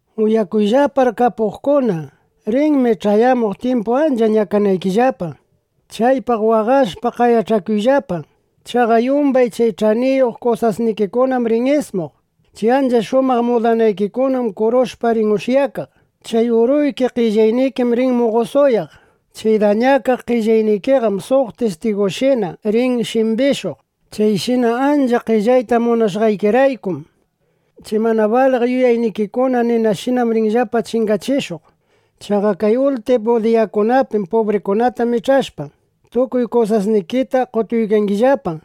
¡Uyakuyllapar kapuqkuna! Rinmi ch'ayamuq tyimpu ancha ñakanaykillapa. Chaypaq waqashpa, qayach'akuyllapa. Chaqa yumbay chay ch'aniyuq kusasnikikunam rin ismuq. Chay ancha shumaq mudanaykikunam kurushpa rin ushyakaq. Chay uruyki, qellaynikim rin muqosuyaq. Chay dañakaq qellaynikiqam suq tistigushina rin shimbishuq. Chayshina achka qellayta munashqaykiraykum, chay mana baliq yuyaynikikuna ninashina rinllapa chingachishuq. Chaqa kay ultimu diyakunapim (pubrikunata mich'ashpa,) tukuy kusasnikita qotuykangillapa.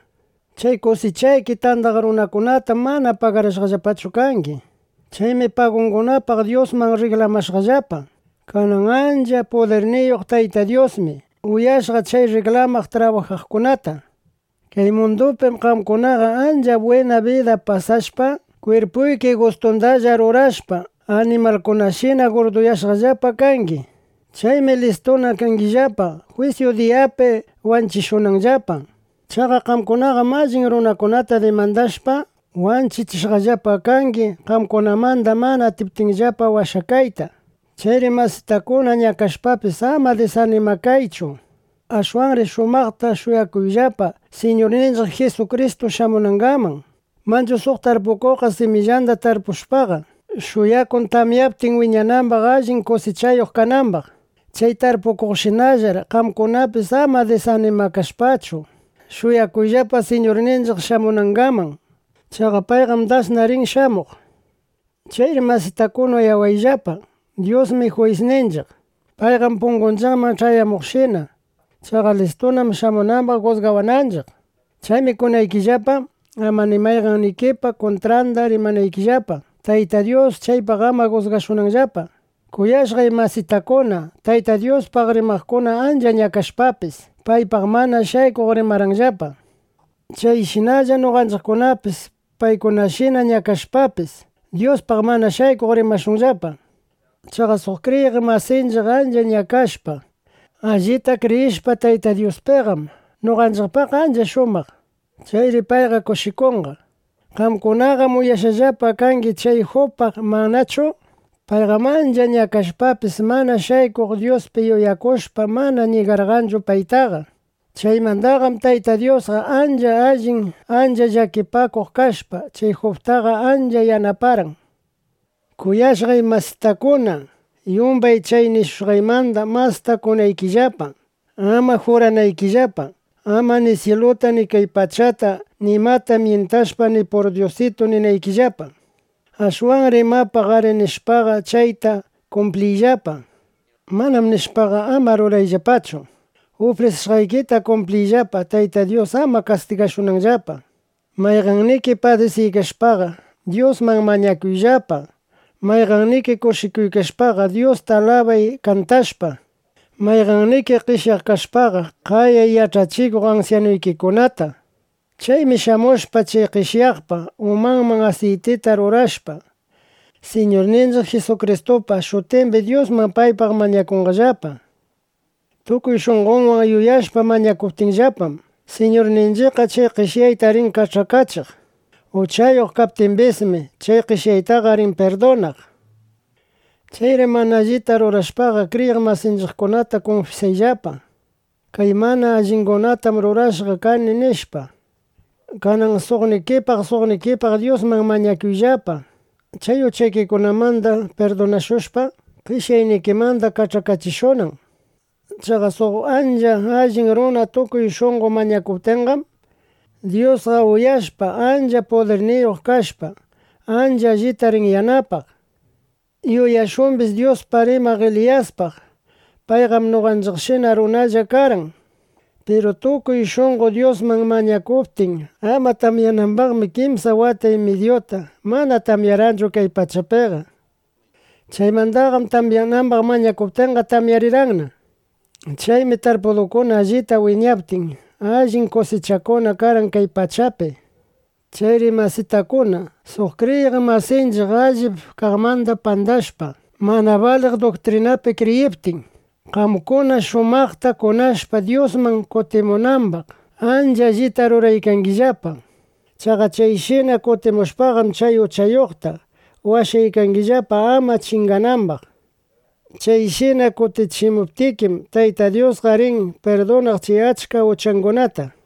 Chay kusichaykita tandaq runakunatam mana pagarashqachu kangi. Chaymi pagungunapaq Dyusman rriklamashqallapa. Kanan ancha pudirniyuq Tayta Dyusmi uyashqa chay rriklamaq trabajaqkunata. Kay mundupim qamkunaqa ancha bwina bida pasashpa, kwirpuykipa gustundalla rurashpa, animalkunashina gurduyashqallapa kangi. Chaymi listuna kangillapa, jwisyu diyapi wanchishunanllapa. Chaqa qamkunaqam allin runakunata dimandashpa, wanchichishqallapa kangi, qamkunamanda mana atiptinllapa washakayta. Chayri masitakuna, ñakashpapis, ama disanimakaychu. Ashwanri shumaqta shuyakuyllapa, Siñurninchiq Jisukristu shamunangaman. Manchu suq tarpukuqqa, simillanda tarpushpaqa, shuyakun tamyaptin wiñanambaq, allin kusichayuq kanambaq. Chay tarpukuqshinallar qamkunapis ama disanimakashpachu, shuyakuyllapa, Siñurninchiq shamunangaman. Chaqa payqam dasna rin shamuq. Chayri masitakuna, uyayllapa: Dyusmi juyisninchiq. Payqam pungunchiqman ch'ayamuykaqshina. Chaqa listunam shamunambaq jusgawananchiq. Chaymi kunaykillapa, ama ni mayqannikipa kuntranda rimanaykillapa, Tayta Dyus chaypaq ama jusgashunanllapa. Kuyashqay masitakuna, Tayta Dyuspaq rimaqkunam ancha ñakashpapis, paypaq mana shaykuq rimarqanllapa. Chayshinalla noqanchiqkunapis paykunashina ñakashpapis, Dyuspaq mana shaykuq rimashunllapa. Chaqa suq kriyiq masinchiq ancha ñakashpa, allita kriyishpa Tayta Dyuspiqam, noqanchiqpaqqa ancha shumaq. Chayri payqa kushikunqa. Qamkunaqam uyashqallapa kangi chay Jubpaq, ¿manachu? Payqam ancha ñakashpapis, mana shaykuq Dyuspi yuyakushpa, mana ñigarqanchu paytaqa. Chaymandaqam Tayta Dyus ancha allin, ancha llakipakuq kashpa, chay Jubtaqa ancha yanaparqan. Piru kuyashqay masitakuna, yumbay chay nishushqaymandam masta kunaykillapa, ama juranaykillapa, ama ni syiluta, ni kay pachata nimata myintashpa, ni “pur dyusitu” ninaykillapa. Ashwanri imapaq “arí” nishpaqa, chayta kumpliyllapa. “Manám” nishpaqa, ama rurayllapachu. Ufrisishqaykita kumpliyllapa, Tayta Dyus ama kastigashunanllapa. Mayqanniki padisiykashpaqa, Dyusman mañakuyllapa. Mayqanniki kushikuykashpaqa, Dyusta alabay kantashpa. Mayqanniki qeshyaq kashpaqa, qayay yach'achikuq ansyanuykikunata. Chaymi shamushpa chay qeshyaqpa umanman asiytita rurashpa, Siñurninchiq Jisukristupa shutimbi Dyusman paypaq mañakunqallapa. Tukuy shunqonwan yuyakushpa mañakuptinllapam, Siñurninchiqqa chay qeshyaqta rin kach'akachiq. Uchayuq kaptimbismi, chay qeshyaqtaqa rin pirdunaq. Chayri mana allita rurashpaqa, kriyiq masinchiqkunata kunfisayllapa: “Kay mana allikunatam rurashqa kani”, nishpa. Kanan suqnikipaq suqnikipaq Dyusman mañakuyllapa, chay uchaykikunamanda pirdunashushpa, qeshyaynikimanda kach'akachishunan. Chaqa suq ancha allin runa tukuy shunqo mañakuptinqam, Dyusqa uyashpa, ancha pudirniyuq kashpa, ancha allita rin yanapaq. Yuyashumbis Dyuspaq rimaq Eliyaspaq. Payqam noqanchiqshina runalla karqan. Piru tukuy shunqo Dyusman mañakuptin ama tamyanambaqmi, kimsa wata y midyuta mana tamyarqanchu kay pachapiqa. Chaymandaqam tamyanambaq mañakuptinqa, tamyarirqanna. Chaymi tarpudukuna allita wiñaptin, allin kusichakuna karqan kay pachapi. Chayri masitakuna, suq kriyiq masinchiq allip kaqmanda pandashpa, mana baliq duktrinapi kriyiptin, qamkuna shumaqta kunashpa Dyusman kutimunambaqqa, ancha allita ruraykangillapa. Chaqa chayshina kutichimushpaqam, chay uchayuqta washaykangillapa, ama chinganambaq. Chayshina kutichimuptikim, Tayta Dyusqa rin pirdunaq chay achka uchangunata.